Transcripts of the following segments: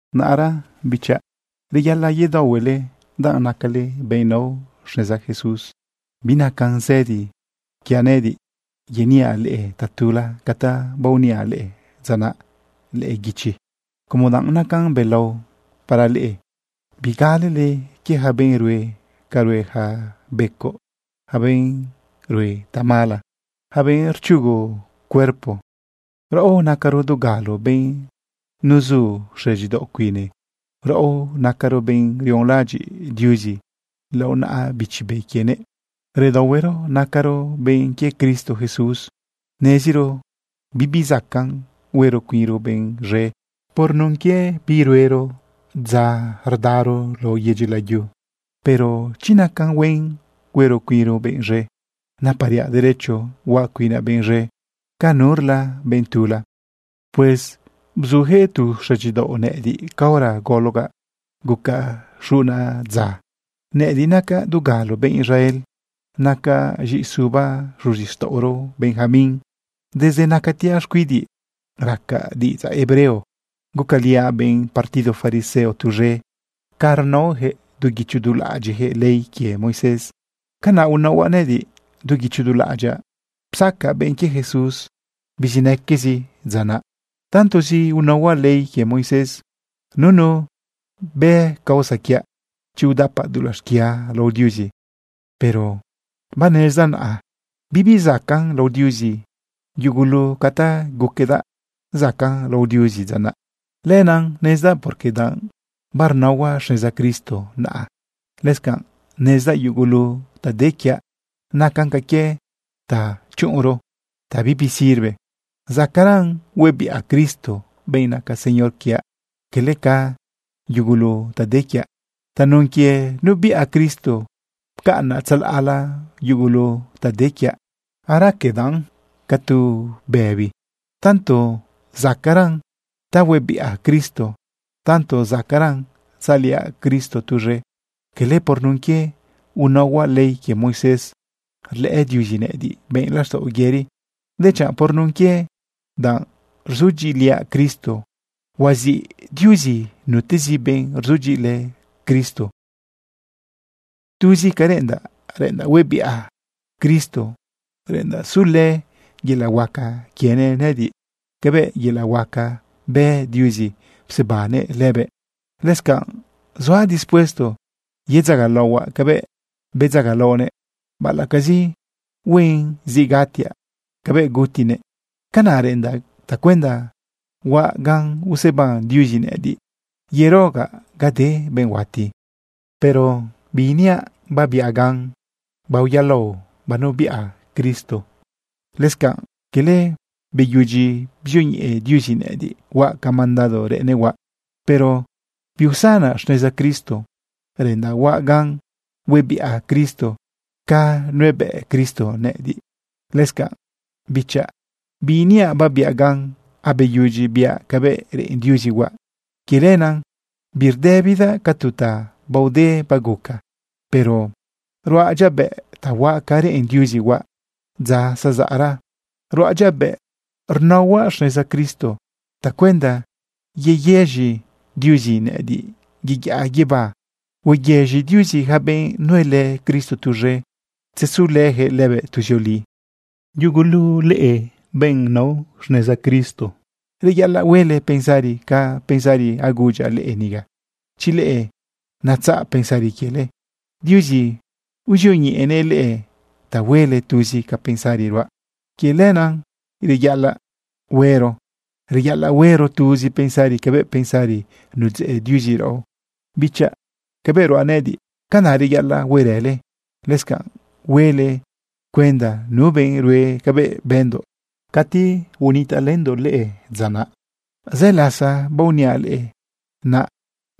Naꞌra bichaꞌ, reyaꞌalaꞌ yedaohuele danꞌ nacale benꞌ nao xneza Jesús. Binacan zëdi para nëꞌëdiꞌ yeniaꞌ leꞌe tatula ca ta baoniaꞌ leꞌe dza naꞌ lëꞌë guichi, como danꞌ nacan belao para leꞌe. Bigalele quie yaca benꞌ rue ca rue yaca becoꞌ, yaca benꞌ rue tamala, yaca benꞌ rchugu cuerpo. Raꞌo nacaro dugalo benꞌ nuzu xëdyidaoꞌ cuine. Raꞌo nacaro benꞌ rionlaꞌadyiꞌ Diuzi lao naꞌa Bichi Be quienëꞌ. Redaohuero nacaro benꞌ quie Cristo Jesús. Neziro bibi zacaꞌn huero cuinro benꞌ z̃e por nun quie bi ruero dza rdaro lao yedyi layu. Pero chi nacan huen huero cuinro benꞌ z̃e, napariaꞌ derecho huaꞌ cuinaꞌ benꞌ z̃e ca nurla benꞌ tula. Pues bzuyaquëꞌ tu xëdyidaoꞌ nëꞌëdiꞌ caora gologaꞌ gucaꞌ xuꞌuna dza. Nëꞌëdiꞌ nacaꞌ dugalo benꞌ Israel. Nacaꞌ z̃iꞌisuba xuzixtaꞌoro Benjamín. Desde nacatiaꞌ xcuidiꞌ racaꞌ diꞌidzaꞌ hebreo. Gucaliaꞌ benꞌ partido fariseo tuz̃e. Ca rnaoyaquëꞌ du guicho du laꞌadyiꞌyaquëꞌ ley quie Moisés, canaꞌ unaohuaꞌ nëꞌëdiꞌ. Du guicho du laꞌadyaꞌ psacaꞌ benꞌ quie Jesús bizinaquezi dza naꞌ. Tantozi unaohuaꞌ ley quie Moisés, nunu bë causa quiaꞌ chi udapaꞌ dulaꞌ xquia lao Diuzi. Pero banezdaꞌ naꞌa bibi zacaꞌn lao Diuzi yugulu ca ta guquedaꞌ zacaꞌn lao Diuzi dza naꞌ. Lenaꞌ nezdaꞌ porque danꞌ barnaohuaꞌ xneza Cristo naꞌa. Lëscanꞌ nezdaꞌ yugulu ta de quiaꞌ nacan ca quie ta chuꞌunro, ta bibi sirve. Zacaꞌran huebiꞌa Cristo, benꞌ naca Señor quiaꞌ, cala ca yugulu ta de quiaꞌ. Tanun quie nubiꞌa Cristo, pcaꞌnaꞌ tzalaꞌla yugulu ta de quiaꞌ. Araquedaꞌn ca tu bëbi, tanto zacaꞌran ta huebiꞌa Cristo, tanto zacaꞌran tzaliaꞌ Cristo tuz̃e. Cala por nun quie unaohuaꞌ ley quie Moisés rlëꞌë Diuzi nëꞌëdiꞌ benꞌ laxtaꞌo yëri, dechanꞌ por nun quie danꞌ rzudyiꞌiliaꞌ Cristo. Huaziꞌ Diuzi nutezi benꞌ rzudyiꞌilë Cristo. Tuzi ca reꞌendaꞌ, reꞌendaꞌ huebiꞌa Cristo. Reꞌendaꞌ sulë yelaꞌ huaca quienëꞌ nëꞌëdiꞌ cabëꞌ yelaꞌ huaca bë Diuzi psebannëꞌ lëbëꞌ. Lëscanꞌ zuaꞌ dispuesto yedzagalaohuaꞌ cabëꞌ bedzagalaonëꞌ, baꞌalaꞌcazi huen zi gatiaꞌ cabëꞌ gutinëꞌ. Canaꞌ reꞌendaꞌ tacuenda huaꞌ gan useban Diuzi nëꞌëdiꞌ yerogaꞌ ga de benꞌ huati. Pero biiniaꞌ babiaꞌ gan baoyaꞌlao banubiꞌa Cristo. Lëscanꞌ cala beyudyi bzioñeꞌe Diuzi nëꞌëdiꞌ huaꞌ ca mandado reꞌennëꞌ huaꞌ. Pero biusanaꞌ xneza Cristo. Reꞌendaꞌ huaꞌ gan huebiꞌa Cristo ca nuebëꞌ Cristo nëꞌëdiꞌ. Lëscanꞌ bichaꞌ, biiniaꞌ babiaꞌ gan abeyudyi biaꞌ cabëꞌ reꞌen Diuzi huaꞌ. Quie lenaꞌ birdëbidaꞌ ca tu ta baode baguca. Pero ruaꞌ dyabëꞌ ta huaꞌ ca reꞌen Diuzi huaꞌ dza zazaꞌra. Ruaꞌ dyabëꞌ rnaohuaꞌ xneza Cristo tacuenda yeyëz̃i Diuzi nëꞌëdiꞌ yeyaꞌa guibá. Hueyëz̃i Diuzi yaca benꞌ nuelë Cristo tuz̃e ta tzezulëyaquëꞌ lëbëꞌ tuzioli. Yugulu leꞌe benꞌ nao neza Cristo, reyaꞌalaꞌ huele pensari ca pensari agudyaꞌ leꞌe niga. Chi leꞌe natzaꞌ pensari quiele, Diuzi uzioñeꞌenëꞌ leꞌe ta huele tuzi ca pensari ruaꞌ. Quie lenaꞌ sí, reyaꞌalaꞌ huero, reyaꞌalaꞌ huero tuzi pensari cabëꞌ pensari nudzeꞌ Diuzi raꞌo. Bichaꞌ, cabëꞌ ruaꞌ nëꞌëdiꞌ, canaꞌ reyaꞌalaꞌ huerële. Lëscanꞌ huele cuenda nu benꞌ rue cabëꞌ bëndoꞌ cati unitaꞌlëndoꞌ leꞌe dza naꞌ. Zë lasa baoniaꞌ leꞌe, naꞌ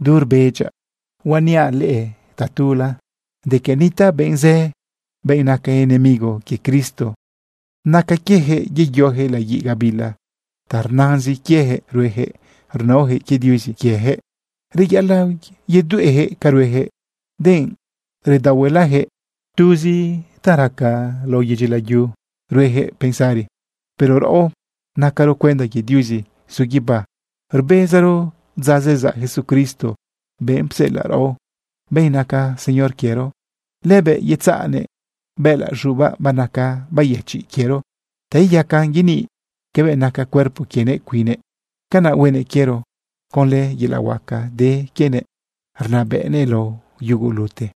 du rbedyaꞌ huaꞌ repetir tatula de que nitaꞌ benꞌ zë, benꞌ naca enemigo quie Cristo. Naca quieyaquëꞌ yeyoyaquëꞌ laguiꞌ gabila. Ta rnazin quieyaquëꞌ rueyaquëꞌ rnaoyaquëꞌ quie diuzi quieyaquëꞌ. Reyaꞌalaꞌ yedueꞌyaquëꞌ ca rueyaquëꞌ, denꞌ redaohuelayaquëꞌ. Tuz ta raca lao yedyi layu ruejëꞌ pensari. Pero raꞌo nacaro cuenda quie Diuzi zu guibá. Rbezaro dza zezaꞌ Jesucristo, benꞌ psela raꞌo, benꞌ naca Señor quiero. Lëbëꞌ yetzaꞌnëꞌ bëꞌëlaꞌ z̃ubaꞌ banaca bayëchiꞌ quiero ta iyacan yeniꞌ cabëꞌ naca cuerpo quienëꞌ cuinnëꞌ. Canaꞌ huenëꞌ quiero conlë yelaꞌ huaca de quienëꞌ rnabëꞌnëꞌ lao yugulute.